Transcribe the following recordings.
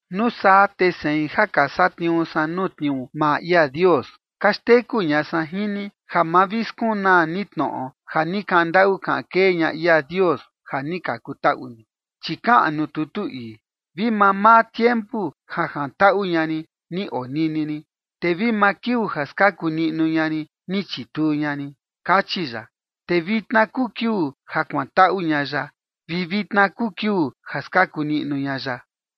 Nuu saa te sein ja ka satniuu san nuu tniuu maa ia Dios, ka xteku ña san jin ni ja ma vi skunaa ni tnoꞌo ja ni kaꞌan ndaꞌu kaꞌan kee ña ia Dios ja ni ka kutaꞌu ni. Chi kaꞌan nuu tutu ii: Vi mamaa tiempu ja jantaꞌu ña rin, ni onini rin; te vi maa kiuu ja skaku niꞌnu ña rin, ni chituu ña rin, kachi ya. Te vitna kuu kiuu ja kuantaꞌu ña ya, vi vitna kuu kiuu ja skaku niꞌnu ña ya.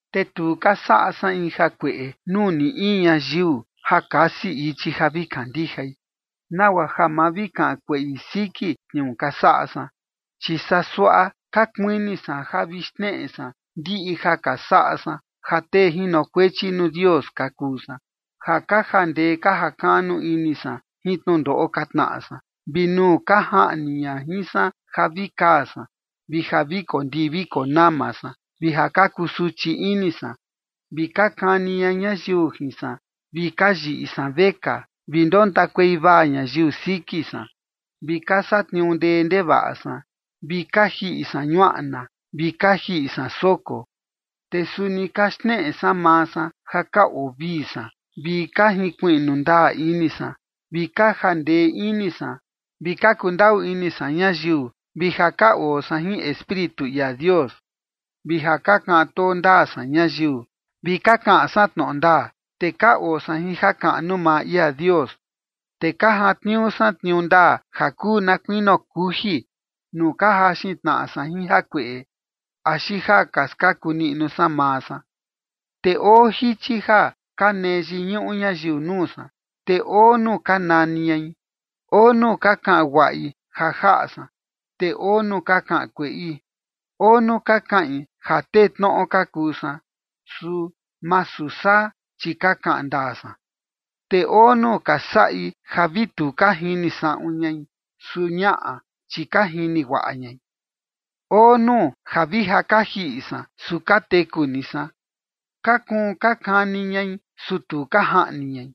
Te tu ka saꞌa san in jakueꞌe nuu ni in ñayiu ja kasi ichi ja vi kandijai, nagua ja ma vi kaꞌan kueꞌi siki tniuu ka saꞌa san. Chi saa suaꞌa ka kuini san ja vi xneꞌe san ndiꞌi ja ka saꞌa san ja tee ka jinokuechi nuu ia Dios ka kuu san, ja ka jandee ka jakaꞌnu ini san jin tnundoꞌo ka tnaꞌa san, vi nuu ka jaꞌni ña jin san ja vi kaa san, vi ja vi kondii vi konama san vi ja ka kusuchi ini san, vi ka kani ña ñayiu jin san vi ka yiꞌi san vekaa, vi ndontakuei vaa ñayiu siki san, vi ka satniuu ndee ndevaꞌa san, vi ka jiꞌi san ñuaꞌna, vi ka jiꞌi san soko. Te suni ka xneꞌe san maa san ja ka oo vii san, vi ka jinkuiꞌnu ndaa ini san, vi ka jandee ini san, vi ka kundaꞌu ini san ñayiu, vi ja ka oo san jin Espíritu ia Dios, vi ja ka kaꞌan too ndaa san ñayiu, vi ka kaꞌan san tnoꞌo ndaa. Te ka oo san jin jakaꞌnu maa ia Dios, te ka jantniuu san tniuu ndaa ja kuu na kuinio kuji nuu ka jaxin tnaꞌa san jin jakueꞌe axi ja ka skaku niꞌnu san maa san. Te oo jichi ja ka nee yiñuꞌu ñayiu nuu san, te oo nuu ka nani ñai. Oo nuu ka kaꞌan guaꞌi ja jaꞌa san, te oo nuu ka kaꞌan kueꞌi. Oo nuu ka kaꞌin ja tee tnoꞌo ka kuu san, su masu saa, chi ka kaꞌan ndaa san. Te oo nuu ka saꞌi ja vi tu ka jini saꞌun ñai, su ñaꞌa, chi ka jini guaꞌa ñai. Oo nuu ja vi ka jiꞌi san, su ka teku ni san. Ka kuun ka kani ñai, su tu ka jaꞌni ñai.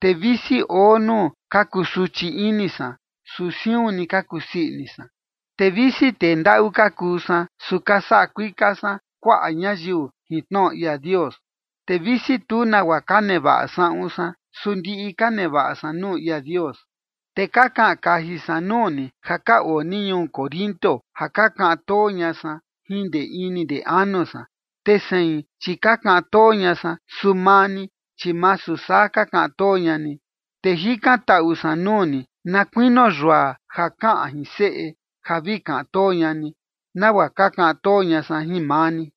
Te visi oo nuu ka kusuchi ini san, su siun ni ka kusii ini san. Te visi tee ndaꞌu ka kuu san, su ka saꞌa kuika san kuaꞌa ñayiu jin tnoꞌo ia Dios. Te visi tu nagua ka nevaꞌa saꞌun san, su ndiꞌi ka nevaꞌa san nuu ia Dios. Te ka kaꞌan kaji san nuu ni ja ka oo ni ñuu Corinto, ja ka kaꞌan too ña san jin ndee ini ndee anu san. Te sein, chi ka kaꞌan too ña san, su maa ni, chi masu saa ka kaꞌan too ña ni. Te jikantaꞌu san nuu ni na kuinio yua ja kaꞌan jin seꞌe, ja vi kaꞌan too ña ni, nagua ka kaꞌan too ña san jin maa ni.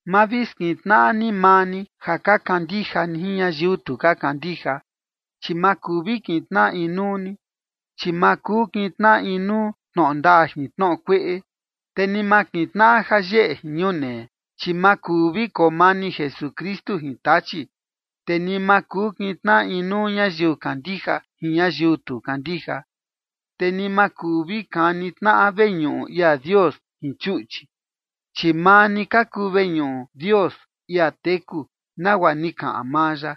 Ma vi skintnaꞌa ni maa ni ja ka kandija ni jin ñayiu tu kandija, chi ma kuu vi kintnaꞌa inuu ni, chi ma kuu kintnaꞌa inuu tnoꞌo ndaa jin tnoꞌo kueꞌe, te ni ma kintnaꞌa jayeꞌe jin ñunee. Chi ma kuu vi koo mani Jesukristu jin Tachi, te ni ma kuu kintnaꞌa inuu ñayiu kandija jin ñayiu tu kandija. Te ni ma kuu vi kani tnaꞌa veñuꞌu ia Dios jin chuꞌchi, chi maa ni ka kuu veñuꞌu Dios, ia teku, nagua ni kaꞌan maa ya: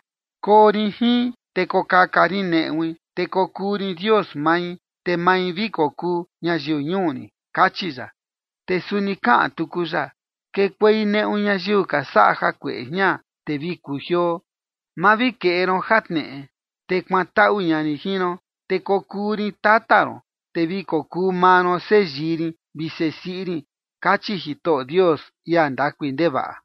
Koo rin jin, te kokaka rin neꞌui, te kokuu rin Dios mai, te mai vi kokuu ñayiu ñuu rin, kachi ya. Te suni kaꞌan tuku ya: Kekuei neꞌu ñayiu ka saꞌa jakueꞌe jian, te vi kujioo. Ma vi keꞌe ron jatneꞌe, te kuantaꞌu ña rin jin ron. Te kokuu rin tata ron, te vi kokuu maa ron seyii rin vi sesiꞌi rin, kachi Jitoꞌo Dios, ia ndakui ndevaꞌa.